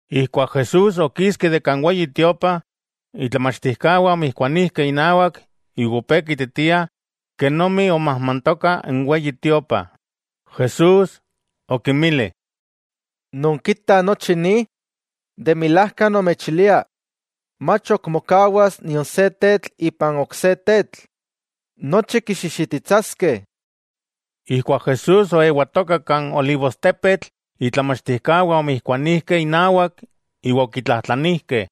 Ijkuak Jesús okiski de kan Weyi Tiopa, itlamachtijkawah omijkuanijkeh inawak iwa opé kiititiah kenomi omajmantoka n Weyi Tiopa. Jesús okinmili: —¿Nonkitah nochi ni? De milajka nomechilia, mach ok mokawas nion se tetl ipan ok se tetl. Nochi kixixititsaskeh. Ijkuak Jesús oewatoka kan Olivostepetl, itlamachtijkawah omijkuanijkeh inawak iwa okitlajtlanijkeh: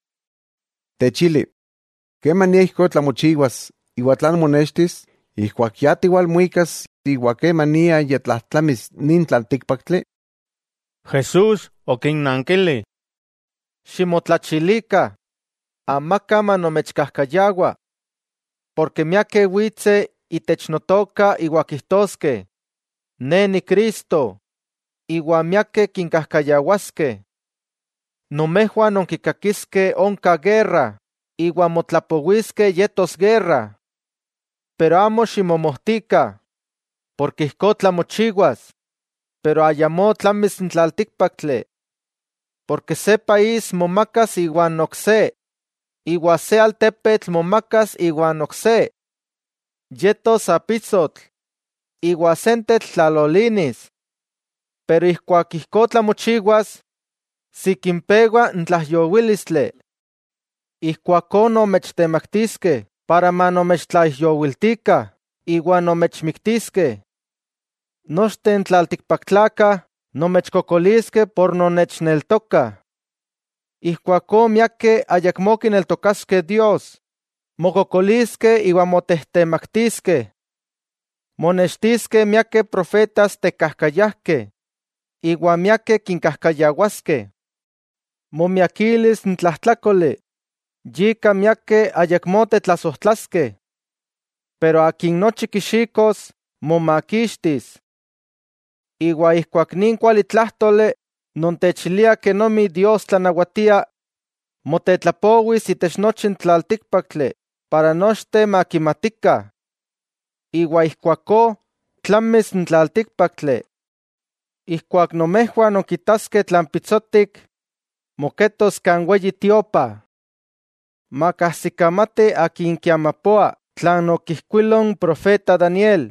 —Techili, ¿kemania ijkó tlamochiwas, iwa tlan monextis ijkuak ya tiwalmuikas iwa kemania ya tlajtlamis nin tlaltíkpaktli? Jesús okinnankili: —Ximotlachilikah, amaka manomechkajkayawa, porke miakeh witseh itech Notoka iwa kijtoskeh: “Ne Ni Cristo”, iwa miakeh kinkajkayawaskeh. Nomejwah nonkikakiskeh onka guerra iwa motlapowiskeh yetos guerra. Pero amo ximomojtikah, porke ijkó tlamochiwas, pero ayamó tlamis n tlaltíkpaktli. Porke se país momakas iwa n ok se, iwa se altepetl momakas iwa n ok se. Yetos apisotl, iwa sentetl tlalolinis. Pero ijkuak ijkó tlamochiwas, sikin pewa n tlaijyowílistli. 'Ijkuakó nomechtemaktiskeh para manomechtlaijyowiltikah iwa nomechmiktiskeh. Nochteh n tlaltikpaktlakah nomechkokoliskeh por nonnechneltokah. Ijkuakó miakeh ayakmó kineltokaskeh Dios, mokokoliskeh iwa motejtemaktiskeh. Monextiskeh miakeh profetas tekajkayajkeh iwa miakeh kinkajkayawaskeh. Momiakilis n tlajtlákoli, yika miakeh ayakmó tetlasojtlaskeh. Pero akin nochi kixikos, momakixtis. Iwa ijkuak nin kualitlájtoli non techilia kenomi Dios tlanawatia, motetlapowis itech nochi n tlaltíkpaktli para nochteh makimatikah. Iwa ijkuakó, tlamis n tlaltíkpaktli. 'Ijkuak nomejwah nonkitaskeh tlan pitsotik moketos kan Weyi Tiopa. Makajsikamati akin kiamapoa tlan okijkuilo n profeta Daniel,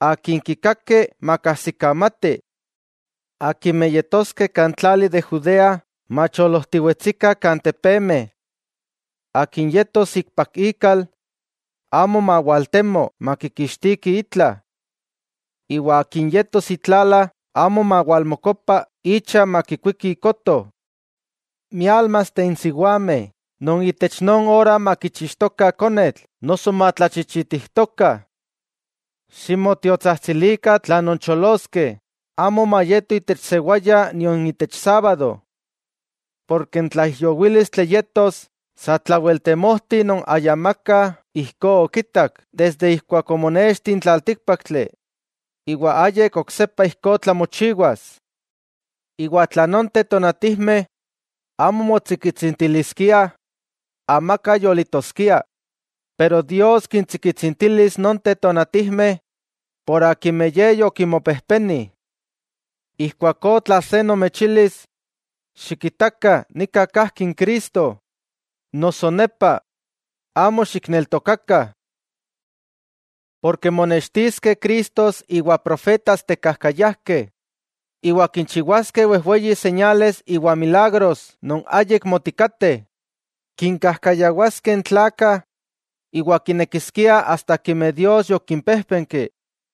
—akin kikaki makajsikamati—, akimeh yetoskeh kan tlali de Judea, macholojtiwetsikah kan tepemeh. Akin yetos ikpak ikal, amo mawaltemo makikixtiki itla, iwa akin yetos itlala amo mawalmokopa icha makikuiki ikoto. ¡Miálmasteh n siwameh non itech non ora makichixtokah konetl noso matlachichitijtokah! Ximotiotsajtsilikah tla noncholoskeh, amo mayeto itech sewaya nion itech sábado, porke n tlaijyowílistli yetos satlawel temojti non ayamaka ijkó okitak desde ijkuak omonexti n tlaltíkpaktli, iwa ayik oksepa ijkó tlamochiwas. Iwa tla nonteh tonatijmeh amo motsikitsintiliskiah, amaka yolitoskia, pero Dios kintsikitsintilis nonteh tonatijmeh por akimeh Ye yokinmopejpeni. 'Ijkuakó tla se nomechilis: “Xikitakah, nika kajki n Cristo” noso, “nepa” amo xikneltokakah. Porke monextiskeh cristos iwa profetas tekajkayajkeh, iwa kinchiwaskeh wejweyi señales iwa milagros non ayik motikateh, kinkajkayawaskeh n tlakah iwa kinekiskiah asta akimeh Dios yokimpéjpenki.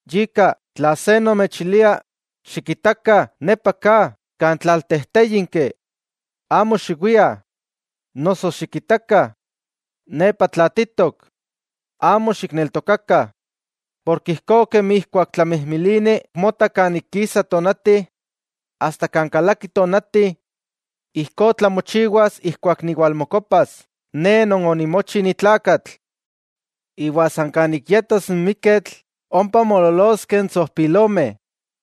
Yika, tla se nomechilia: “Xikitakah nepa ka kan tlaltejtéyinki”, amo xiwiah, noso: “Xikitakah, nepa tlaatitok”, amo xikneltokakah. Porke ijkó kemi ijkuak tlamijmilini mota kan ik kisa tonati asta kan kalaki tonati, ijkó tlamochiwas ijkuak niwalmokopas Ne Non onimochi ni tlakatl. Iwa san kan ik yetos n miketl ompa moololoskeh n tsojpilomeh.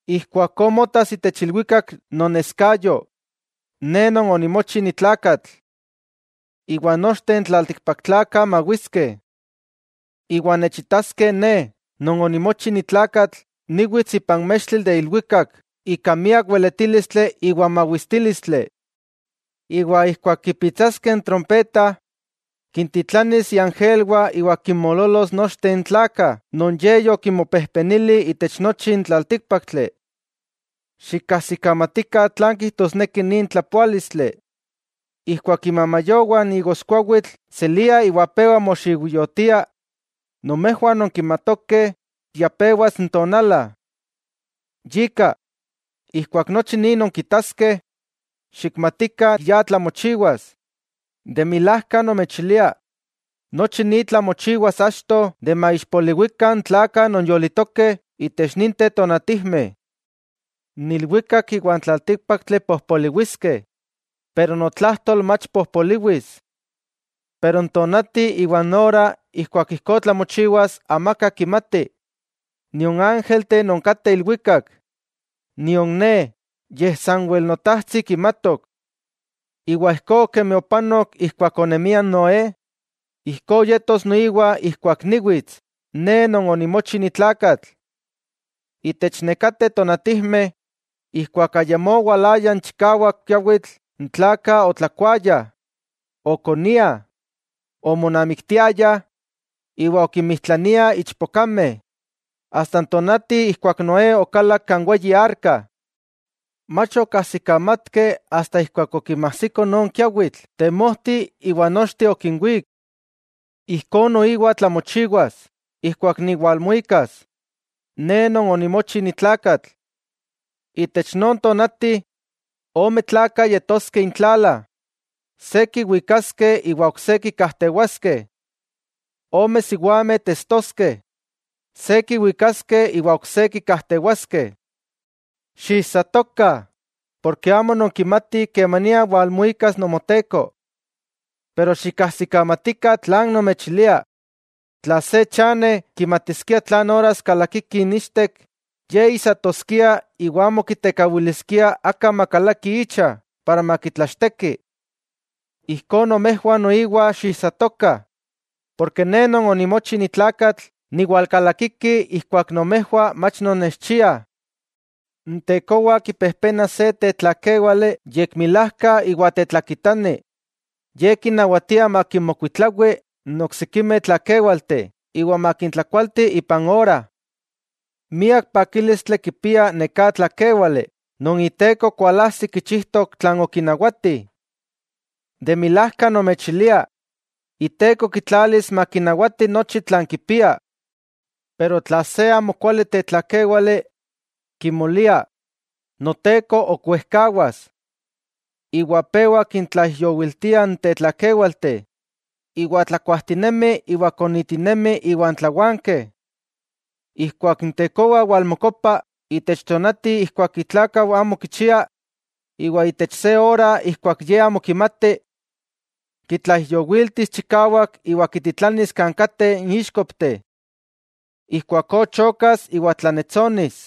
Ijkuakó motas itech ilwikak noneskayo Ne Non onimochi nitlakatl. Iwa nochteh n tlaltikpaktlakah mawiskeh. Iwa nechitaskeh Ne Non onimochi nitlakatl, niwits ipan mextli de ilwikak ika miak weletílistli iwa mawistílistli. Iwa ijkuak kipitsaskeh n trompeta kintitlanis iangelwah iwa kinmoololos nochteh n tlakah non Ye yokinmopejpenili itech nochi n tlaltíkpaktli. 'Xikkajsikamatikah tlan kijtosneki nin tlapoálistli: Ijkuak imamayowah n igoskuawitl seliah iwa pewa moxiujyotiah, nomejwah nonkimatokeh ya pewas n tonala. Yika, ijkuak nochi ni nonkitaskeh, xikmatikah ya tlamochiwas. De milajka nomechilia, nochi ni tlamochiwas achto de maixpoliwikah n tlakah non yolitokeh itech ninteh tonatijmeh. N ilwikak iwa n tlaltíkpaktli pojpoliwiskeh, pero notlajtol mach pojpoliwis. 'Pero n tonati iwa n ora ijkuak ijkó tlamochiwas amaka kimati, nion ángelteh non kateh ilwikak, nion Ne, yej sanwel Notajtsi kimatok. 'Iwa ijkó kemi opanok ijkuak onemia n Noé, ijkó yetos noiwa ijkuak niwits Ne Non onimochi ni tlakatl. Itech nekateh tonatijmeh ijkuak ayamó owalaya n chikawak kiawitl, n tlakah otlakuayah, okoniah, omonamiktiayah iwa okinmijtlaniah ichpokameh, asta n tonati ijkuak Noé okalak kan weyi arka. Mach okajsikamatkeh asta ijkuak okinmajsiko non kiawitl temojti iwa nochteh okinwík. Ijkó noiwa tlamochiwas ijkuak niwalmuikas, Ne Non onimochi ni tlakatl. Itech non tonati, ome tlakah yetoskeh intlala. Se kiwikaskeh iwa ok se kikajtewaskeh. Ome siwameh testoskeh. Se kiwikaskeh iwa ok se kikajtewaskeh. 'Xiijsatokah, porke amo nonkimatih kemania walmuikas Nomoteko. Pero xikkajsikamatikah tlan nomechilia: tla se chane kimatiskia tlan oras kalakiki n ichtek, ye ijsatoskia iwa amo kitekawiliskia aka makalaki icha para makitlachteki. Ijkó nomejwah noiwa xiijsatokah, porke Ne Non onimochi ni tlakatl niwalkalakiki ijkuak nomejwah mach nonnechchiah. 'N tekowa kipejpena se tetlakéwali yekmilajka iwa tetlakitani, ye kinawatia makinmokuitlawi n oksikimeh tlakéwalteh iwa makintlakualti ipan ora. ¡Miak pakílistli kipia neká tlakéwale non iteko kualajsi kichijtok tlan okinawati! De milajka nomechilia, iteko kitlalis makinawati nochi tlan kipia. Pero tla se amo kuali tetlakéwale, kimolia: “Noteko ok wejkawas”, iwa pewa kintlaijyowiltia n tetlakéwalteh, iwa tlakuajtinemi iwa konitinemi iwan tlawankeh. Ijkuak n tekowa walmokopa itech tonati ijkuak itlákau amo kichia, iwa itech se ora ijkuak ye amo kimati, kitlaijyowiltis chikawak iwa kititlanis kan kateh n íxkopteh. Ijkuakó chokas iwa tlannetsonis.